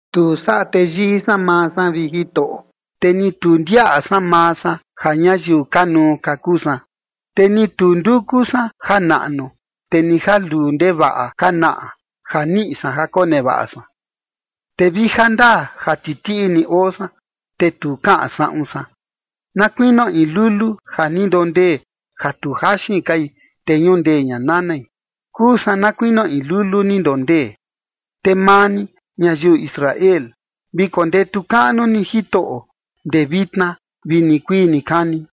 Tu saꞌa teyii san maa san, vi Jitoꞌo, te ni tu ndiaꞌa san maa san ja ñayiu kanuu ka, kuu san, te ni tu nduku san janaꞌnu, te ni ja luu ndevaꞌa ka naꞌa ja niꞌi san ja konevaꞌa san. Te vi jandaa ja titiꞌi ni oo san, te tu kaꞌan saꞌun san, na kuinio in lulu ja ni ndondee ja tu jaxin kai, te ñundee ña nanai. Kuu san na kuinio in lulu ni ndondee. Te maa ni, ñayiu Israel, vi kondetu kaꞌnu ni Jitoꞌo, ndee vitna vi nikuii nikani.